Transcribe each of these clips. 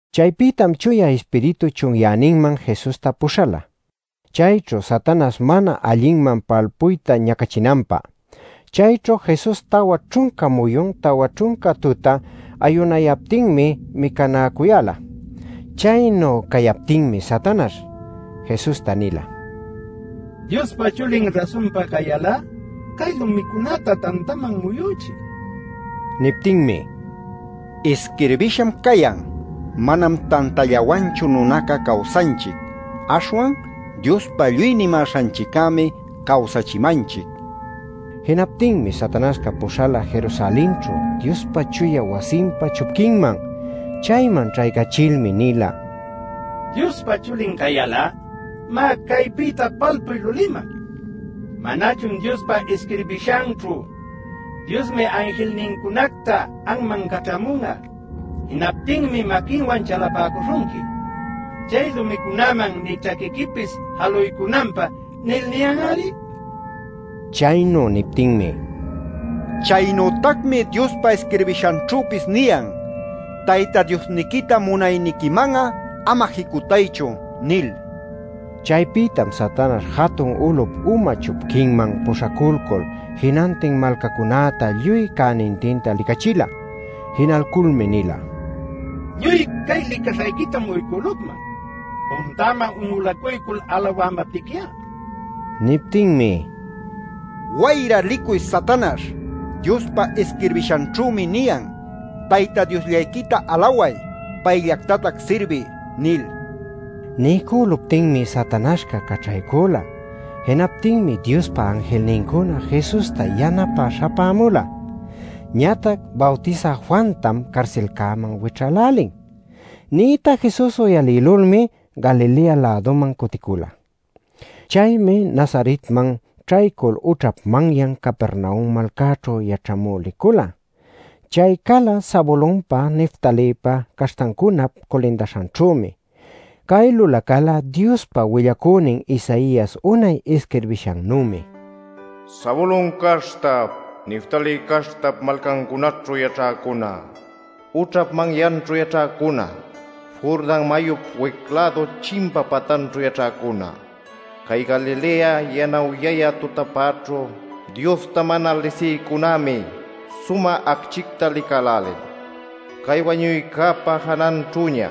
Chaypïtam Chuya Ispiritu chunyäninman Jesusta puśhala, chayćhu Satanaśh mana allinman palpuyta ñacachinanpä. Chayćhu Jesus tawa ćhunca muyun, tawa ćhunca tuta ayunayaptinmi micanäcuyäla. Chaynu cayaptinmi Satanaśh Jesusta nila: “Diospa Chulin rasunpa cayal'a, cay lumicunäta tantaman muyuchiy” nil. Niptinmi: “Isquirbisham cayan: ‘Manam tantallawanchu nunaca cawsanchic. Aśhwan Diospa lluy nimäśhanchiccämi cawsachimanchic’ nil” nila. Jinaptinmi Satanaśhca puśhala Jerusalenćhu Diospa chuya wasinpa chupquinman. Chayman ćhaycachilmi nila: “Diospa Chulin cayal'a, má, caypïta palpuy luliman. ¿Manachun Diospa isquirbishanćhu: ‘Diosmi anjilnincunacta anman caćhamun'a. Jinaptinmi maquinwan chalapäcuśhunqui, chay lumicunäman nï ćhaquiquipis jaluycunanpä’ nil niyan-ari?” Chaynu niptinmi: “Chaynütacmi Diospa isquirbishanćhüpis niyan: ‘Tayta Diosniquita munayniquiman'a ama jicutaychu’ nil” nila. Chaypïtam Satanaśh jatun ulup uma chupquinman puśhalcul jinantin malcacunäta lluy cänintinta licachila. Jinalculmi nila: “Lluy cay licaśhayquitam uycülucman, puntäman un'ulacuycul alawamaptiqui'a” nil. Niptinmi: “¡Wayra licuy Satanaśh! Diospa isquirbishanćhümi niyan: ‘Tayta Diosllayquita alaway; payllactatac sirbiy’ nil” nila. Niycüluptinmi Satanaśhca caćhaycüla. Jinaptinmi Diospa anjilnincuna Jesusta yanapä śhapämula. Ñatac “Bawtisä Juantam carsilcäman wićhälälin” nïta Jesus uyalïlulmi Galilea-läduman cutila. Chaymi Nazaretman ćhaycul ućhap manyan Capernaum malcaćhu yaćhamü licula. Chay cala Zabulonpa Neftalïpa caśhtancunap culindanćhümi. Cay lulacäla Diospa willacünin Isaias unay isquirbishannümi: “Zabulon caśhtap, Neftalí caśhtap malcancunaćhu yaćhäcuna, ućhap manyanćhu yaćhäcuna, Jordan mayup wic-lädu chimpa patanćhu yaćhäcuna, cay Galilea yanawyayä tutapäćhu Diosta mana lisïcunämi, sumä acchïta licälälin. Cay wañuycäpa jananćhüña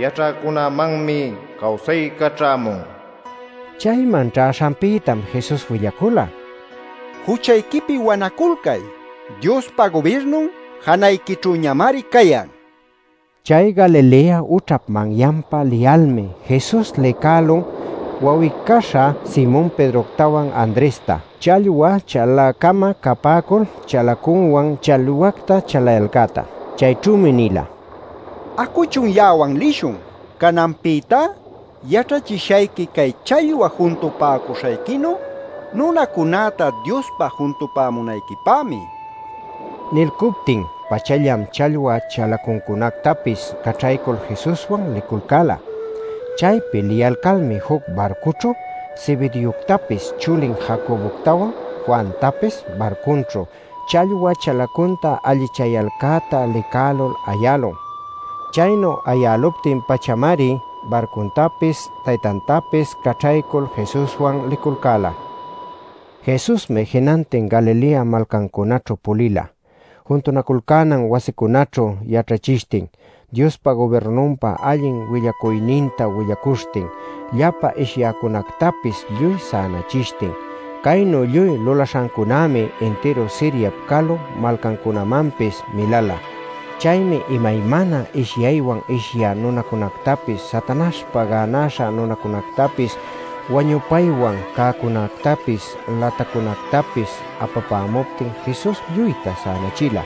yaćhäcunämanmi cawsayca ćhämun” nil. Chayman ćhäśhanpïtam Jesus willacula: “Juchayquipi wanaculcay. Diospa gubirnun janayquićhüñamari cayan” nil. Chay Galilea ućhap manyanpa liyalmi Jesus licälun wawi-caśha Simon Pedroctawan Andresta, challwa chalä-cama capäcul chalacunwan challwacta chalayalcäta. Chayćhümi nila: “Acuchun ya'awan lishun. Cananpïtá yaćhachishayqui cay challwa juntupäcuśhayquinu nunacunäta Diospä juntupämunayquipämi” nil. Nilcuptin-pachallam challwa chalacuncunactapis caćhaycul Jesuswan liculcäla. Chaypi liyalcalmi juc barcućhu Zebedeoctapis chulin Jacoboctawan Juantapis barcunćhu challwa chalacunta allichayalcäta licälul ayälun. Chaynu ayäluptin-pachamari barcuntapis, taytantapis caćhaycul Jesuswan liculcäla. Jesusmi jinantin Galileap malcancunaćhu pulila, juntunaculcänan wasicunaćhu yaćhachishtin, Diospa gubirnunpa allin willacuyninta willacuśhtin, llapa ishyäcunactapis lluy sänachishtin. Caynu lluy lulaśhancunämi intiru Siriap calu malcancunamanpis miläla. Chaymi imaymana ishyaywan ishyä nunacunactapis, Satanaśhpa gänaśha nunacunactapis, wañupaywan cäcunactapis, latacunactapis apapämuptin Jesus lluyta sänachila.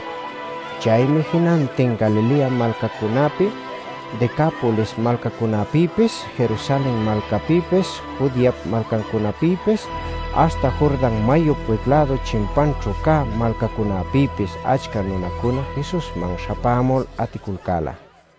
Chaymi jinantin Galilea malcacunäpi, Decapolis malcacunapïpis, Jerusalen malcapïpis, Judeap malcancunapïpis, aśhta Jordan mayup wic-lädu chimpanćhu cä malcacunapïpis achca nunacuna Jesusman śhapämul aticulcäla.